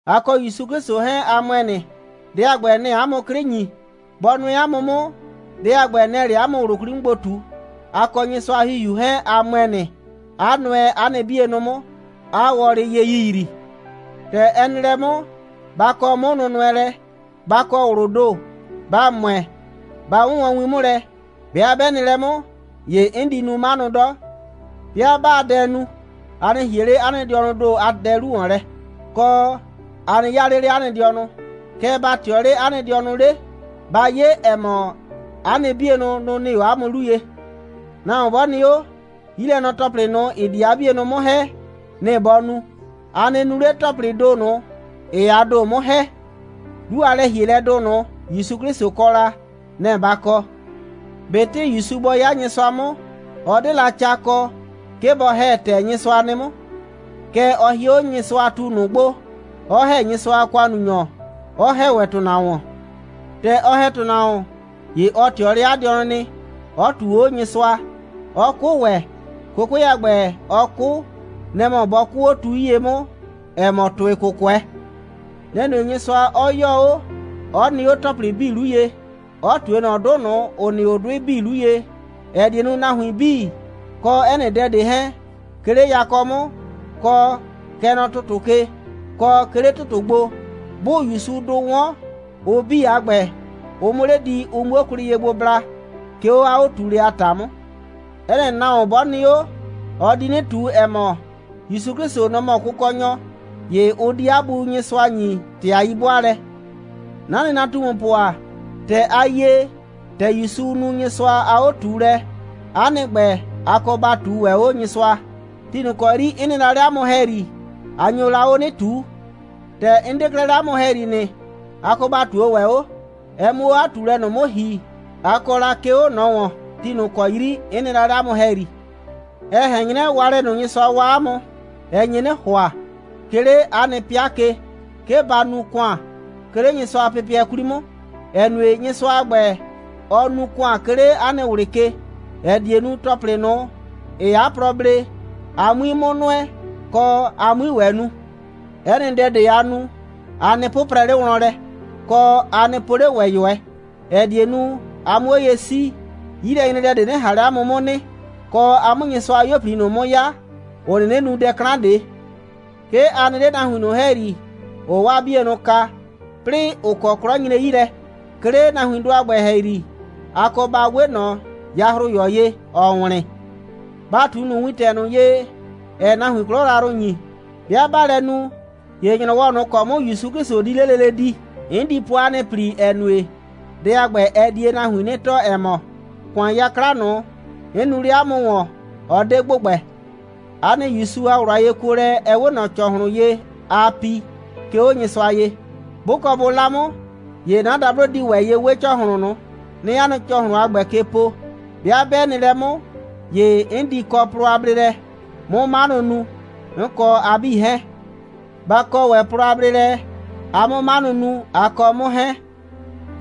A kɔ ‑Yusu 'Klɩsʋ 'hɛɛn, a ‑mʋɛ nɩ. Dɛ a ‑gbɛ, nɛ‑ɛ 'a mʋ 'klɩ ‑nyi. Bɔ nʋɛ 'a mʋ 'mʋ, dɛ a ‑gbɛ, nɛ‑ɛ 'le 'a mʋ ꞊wlʋ 'kwli 'mʋ gbo ꞊tu. A kɔ Nyɩsʋa a ‑Hihiu 'hɛɛn, a ‑mʋɛ nɩ, 'a nʋɛ 'a nɩ 'bienʋ 'mʋ, 'aa wɔlɩ ye yiyrii. ‑Tɛ ɛ nɩ lɛ 'mʋ, ba kɔ 'mʋnʋnʋɛlɛ, ba kɔ ꞊wlʋʋ ‑do, ba ‑mʋɛ, ba 'wʋnwɔn win 'mʋ lɛ. 'Bɩa 'bɛ nɩ lɛ 'mʋ, ‑ye 'n di nu 'manʋ 'dɔ. 'Bɩa 'baa dɛ nu, a nɩ ‑hie 'le 'a nɩ dɩɔnʋʋ ‑do a dɛ 'lu ‑wɔn lɛ, kɔ, a nɩ 'yaa 'le 'le 'a nɩ dɩɔnʋ, kɛɛ, ba ꞊tɩɔ 'le 'a nɩ dɩɔnʋ 'le. Ba 'ye, ‑ɛ mɔ, 'a nɩ 'bienʋ, nʋ‑ nɩ 'o 'a mʋ 'lu ye. Nahuon 'bɔ nɩ 'o, 'yilɛnɔ‑tɔplɩ ꞊nʋ, ‑ɩ di 'a 'bienʋ 'mʋ ‑hɛ, nɩ‑ bɔ nu. A nɩ nu 'le ‑tɔplɩɩ ‑do ꞊nʋ, ‑ɩɩ a ‑do 'mʋ ‑hɛ. 'Lu a lɛ‑hielɛdʋ ꞊nʋ, ‑Yusu 'Klɩsʋ kɔ la, nɛ‑ ba kɔ. ꞊Betɩ ‑Yusu bɔ 'ya Nyɩsʋa 'mʋ, ɔ 'de la ca kɔ, 'ke bɔ ‑hɛ ‑tɛ Nyɩsʋa nɩ 'mʋ. Kɛɛ, ɔ hie 'o Nyɩsʋatu ꞊nʋ gbo, 'ɔ ‑hɛ Nyɩsʋa a ‑kʋannunyɔ, 'ɔ ‑hɛ ‑wɛ ‑tʋnahuon. ‑Tɛ ɔ ‑hɛ ‑tʋnahuon, ‑ye ɔ ꞊tɩɔ 'le 'a dɩɔnʋ nɩ, 'ɔ ꞊tuu 'o Nyɩsʋa, 'ɔ 'kʋ ‑wɛ. 'Kʋkʋɛ a ‑gbɛ, ɔ 'kʋ, nɛ‑ mɔ bʋ kʋɔ 'o tu 'yie 'mʋ, ‑ɛ mɔ ‑tʋɩ'kʋkʋɛ. Nɛ‑ nue, Nyɩsʋa 'ɔ 'yɔɔ 'o, 'ɔ nɩ 'o ‑tɔplɩ 'bii 'lu ye, 'ɔ ꞊tue ꞊nɔ 'dʋ ꞊nʋ, ‑ʋ nɩ 'o 'dʋɩ 'bii 'lu ye, ‑ɛ die nu, nahuin 'bii, kɔ 'ɛ nɩ dɛ ꞊de 'hɛɛn, 'ke 'le yakɔ 'mʋ, kɔ, kɛ nɔ ‑tʋtʋ ke, kɔ, 'ke 'le ‑tʋtʋ gbo, 'bʋʋ ‑Yusudʋ 'wɔn, ʋ 'bii a ‑gbɛ, ʋ 'mʋ 'le di, ʋ 'muo kwlɩ ye gbo bla, 'ke 'o 'a 'o꞊tuulɛ a ‑ta 'mʋ. 'Ɛ nɩ nahuon, 'bɔ nɩ 'o, ɔ di 'nɩ ꞊tu, ‑ɛ mɔ, ‑Yusu 'Klɩsʋ, nɔ‑ mɔ Kʋkɔnyɔ. ‑Ye ʋ di 'a Bu Nyɩsʋa ‑nyi ‑tɩ a 'yi'bʋaalɛ. 'Na nɩnatumupʋ ‑a, ‑tɛ a yie, ‑tɛ ‑Yusu nu Nyɩsʋa a 'o꞊tuulɛ, 'a nɩ ‑gbɛ, a kɔ ba ꞊tuu ‑wɛ 'o Nyɩsʋa. Ti ꞊nʋ ‑kɔ 'yri 'n nɩ la 'le 'a mʋ ‑hɛyri, a nyo la 'o 'nɩ ꞊tuu. ‑Tɛ 'n 'de 'klɛɛ 'le 'a mʋ ‑hɛyri nɩ, a kɔ ba ꞊tuo ‑wɛ 'o, ɛ 'mʋ 'o 'a 'o꞊tuulɛ ꞊nʋ 'mʋ ‑hi, a kɔ la, 'ke 'o ꞊nɔ ‑wɔn, ti ꞊nʋ ‑kɔ 'yri 'n nɩ la 'le 'a mʋ ‑hɛyri. Ɛ ꞊hɛn 'nyrɛ, waalɛ ꞊nʋ, Nyɩsʋa waa 'a mʋ, ɛ nye 'nɩ ‑hʋa, 'ke 'le 'a nɩ 'pɩa ke, 'ke ba nu ‑kʋan, 'ke 'le Nyɩsʋa a pɩpɩɛ 'kwli 'mʋ, ‑ɛ nue, Nyɩsʋa a ‑gbɛ, ɔɔ nu ‑kʋan, 'ke 'le 'a nɩ ꞊wlɩ ke, ‑ɛ die nu, ‑tɔplɩ ꞊nʋ, ‑ɩɩ 'a plɔ blee, a 'mui 'mʋ nʋɛ, kɔ a 'mui ‑wɛ nu. 'Ɛ nɩ dɛ ꞊de, aa nu, a nɩ 'pʋprɛ 'le wlɔn 'mʋ lɛ, kɔ, a nɩ po 'le ‑wɛ ꞊yʋɛ, ‑ɛ die nu, a 'mʋ 'o ye 'sii, 'yilɛnyredɛ ꞊de 'nɩ ꞊han 'le 'a mʋ 'mʋ nɩ, kɔ, a 'mʋ Nyɩsʋa a 'yuo꞊pli ꞊nʋ 'mʋ 'ya, ‑ʋ 'nɩnɩ nu dɛ 'klan ꞊de. 'Ke a nɩ 'le nahuin ꞊nʋ ‑hɛyri, ‑ʋʋ 'waa 'bienʋ kaa, 'plɩɩ ‑ʋ kɔ 'klɔ nyre 'yi lɛ. 'Ke 'le nahuindʋ a ‑gbɛ ‑hɛyri, a kɔ ba 'we ꞊nɔ yahroyɔ ye, ‑ɔɔ wlɩn. Ba ꞊tu ꞊nʋ wintɛ ꞊nʋ ye, ‑ɛɛ nahuin 'klɔ yrayrʋ ‑nyi. 'Bɩa 'baa lɛ nu, ‑ye ‑nyrɔwɔ ꞊nʋ ‑kɔ 'mʋ ‑Yusu 'Klɩsʋ di 'le lele di, 'n di po 'a nɩ ‑pli, ‑ɛ nue, dɛ a ‑gbɛ, ɛ die nahuin 'nɩ tɔɔ, ‑ɛ mɔ, ‑kʋan 'yakla ꞊nʋ, 'n nu 'le 'a mʋ ‑wɔn, ɔ 'de ‑gbʋgbɛ. 'A nɩ ‑Yusu a ꞊wlʋ a yekuolɛ, ɛ 'we ꞊nɔ ‑cɔhlʋn ye, aa pi, 'ke 'o Nyɩsʋa ye. 'Bʋ kɔ bʋ 'la 'mʋ, ‑ye 'na dablo di ‑wɛ ye 'we ‑cɔhlʋn ꞊nʋ, 'nɩɩ 'a nɩ ‑cɔhlʋn a ‑gbɛ ke po. 'Bɩa 'bɛ nɩ lɛ 'mʋ, ‑ye 'n di kɔ plɔ a bleelɛ, 'mʋ 'manʋ nu, 'n kɔ a 'bii 'hɛɛn. Ba kɔ ‑wɛ plɔ a bleelɛ, a 'mʋ 'manʋ nu, a kɔ 'mʋ 'hɛɛn.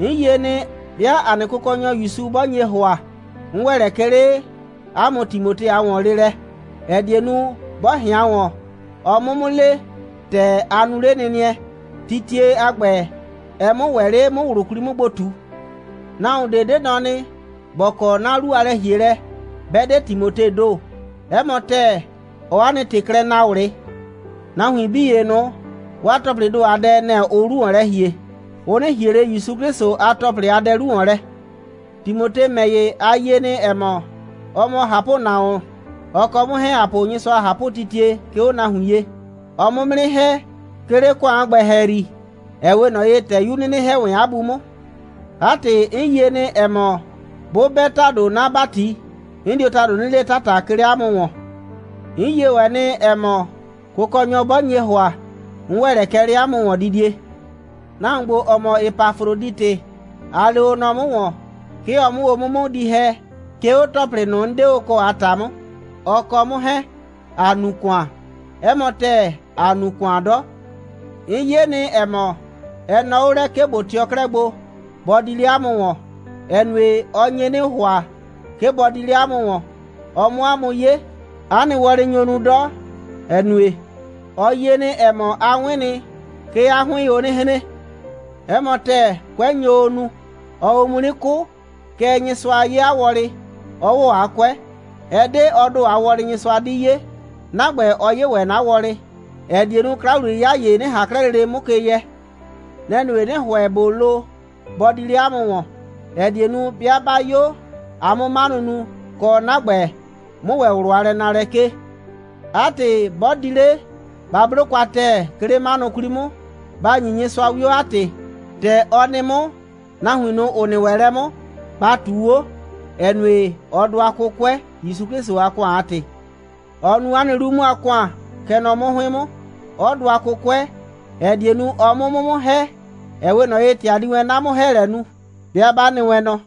'N yie nɩ, 'bɩa ‑a nɩ Kʋkɔnyɔ ‑Yusu 'bɔ nye ‑hʋa, 'n ‑wɛ lɛ kɛ 'le 'a mʋ Timote a ‑wɔnleelɛ, ‑ɛ die nu, 'bɔ ꞊hɩan ‑wɔn, ɔ 'mʋ 'mʋ le, ‑tɛ a nu 'lenɩnɩɛ, titie a ‑gbɛ, ɛ 'mʋ ‑wɛ 'le 'mʋ ꞊wlʋ 'kwli 'mʋ gbo ꞊tu. Nahuon ꞊de 'de nɔ nɩ, ‑bɔ kɔ 'na 'lu a lɛ‑hielɛ, 'bɛ 'de Timotee ‑do. 'Ɛ mɔ ‑tɛɛ, ɔɔ 'a nɩ ‑tɩ klɛ naa ꞊wlɩ. Nahuin 'bii ‑ye ꞊nʋ, 'waa ‑tɔplɩɩ ‑do a dɛ, nɛ‑ ʋʋ 'lu ‑wɔn lɛ ‑hie. Ʋ 'nɩ ‑hie ꞊le ‑Yusu 'Klɩsʋ a ‑tɔplɩ a dɛ 'lu ‑wɔn lɛ. Timote ‑mɛ ‑ye, a yie nɩ, ‑ɛ mɔ, ɔ mɔ ꞊hapʋnahuon. Ɔ kɔ 'mʋ 'hɛɛn, ‑a po Nyɩsʋa a ꞊hapʋtitie, 'ke 'o nahuin ye. Ɔɔ 'mʋ 'mʋ 'nɩ ‑hɛ, 'ke 'le ‑kʋan a ‑gbɛ ‑hɛyri, ‑ɛ 'we ꞊nɔ ye, ‑tɛ 'yu 'nɩnɩ ‑hɛ wɛn 'a bu 'mʋ. 'A ‑tɩ, 'n yie nɩ, ‑ɛ mɔ, 'bʋ 'bɛ ‑tado 'na ‑bati, 'n dio ‑tado 'nɩ le 'tata, 'ke 'le 'a mʋ ‑wɔn. 'N yie ‑wɛ nɩ, ‑ɛ mɔ, Kʋkɔnyɔ 'bɔ nye ‑hʋa, 'n ‑wɛ lɛ kɛ 'le 'a mʋ ‑wɔndidie. Nahuon ‑gbo, ‑ɔ mɔ Epafroditɩ, a lee o nɔ 'mʋ ‑wɔn, 'ke ɔ 'mʋ o 'mʋ 'mʋ di ‑hɛ, 'ke 'o ‑tɔplɩ ꞊nʋ, 'n 'de o kɔ a ‑ta 'mʋ, ɔ kɔ 'mʋ 'hɛɛn, ‑a nu ‑kʋan. 'Ɛ mɔ ‑tɛɛ, ‑a nu ‑kʋan 'dɔ. 'N 'ye nɩ, ‑ɛ mɔ, ɛ nɔɔ 'o lɛ, 'ke ꞊bo tɩɔ 'klɛɛ gbo, bɔ di 'le 'a mʋ ‑wɔn, ‑ɛ nue, ɔ nye 'nɩ ‑hʋa, 'ke bɔ di 'le 'a mʋ ‑wɔn, ɔ 'mʋ 'a mʋ 'ye. 'A nɩ wɔlɩ nyo nu 'dɔ, ‑ɛ nue, ɔ yie nɩ, ‑ɛ mɔ, a 'wɩn nɩ, 'ke 'a 'hʋɩɩn o 'nɩ hren. 'Ɛ mɔ ‑tɛɛ, 'kʋɛ nyo o nu. Ɔɔ o mu 'nɩ 'kʋ. Kɛɛ, Nyɩsʋa 'ye 'a wɔlɩ, 'ɔ ‑wɔ 'a 'kʋɛ. Ɛ 'de ɔ ‑do a wɔlɩ, Nyɩsʋa 'di 'ye. 'Na ‑gbɛ, ɔ 'ye ‑wɛ 'na wɔlɩ, ‑ɛ die nu, 'kla‑wliye'yɩya ‑ye 'nɩ ꞊han 'klɛɛ lele 'mʋ ke yɛ. Nɛ‑ nue, 'nɩ ‑hʋɛ, ꞊bo lo, bɔ di 'le 'a mʋ ‑wɔn, ‑ɛ die nu, 'bɩa 'ba 'yo, a 'mʋ 'manʋ nu, kɔ, 'na ‑gbɛ, 'mʋ ꞊wlʋ a lɛnaalɛ 'kee. 'A ‑tɩ, 'bɔ di 'le, ba 'blo kwa ‑tɛɛ, 'ke 'le 'manʋ 'kwli 'mʋ. Ba ‑nyi Nyɩsʋa 'wio, 'a ‑tɩ. ‑Tɛ ɔ nɩ 'mʋ, nahuin ꞊nʋ, ‑ʋ nɩ ‑wɛ lɛ 'mʋ, ba ꞊tuu 'o, ‑ɛ nue, ɔ dʋa 'kʋkʋɛ, ‑Yusu 'Klɩsʋ a ‑kʋan a ‑tɩ. Ɔ nu 'a nɩ 'lu 'mʋ a ‑kʋan, kɛ nɔ 'mʋ 'hʋɩn 'mʋ, 'ɔ dʋa 'kʋkʋɛ, ‑ɛ die nu, ɔ 'mʋ 'mʋ 'mʋ ‑hɛ, ‑ɛ 'we ꞊nɔ ye, ‑tɛ a di wɛn 'na 'mʋ‑hɛɛlɛ nu, 'bɩa 'ba nɩ wɛn nɔ.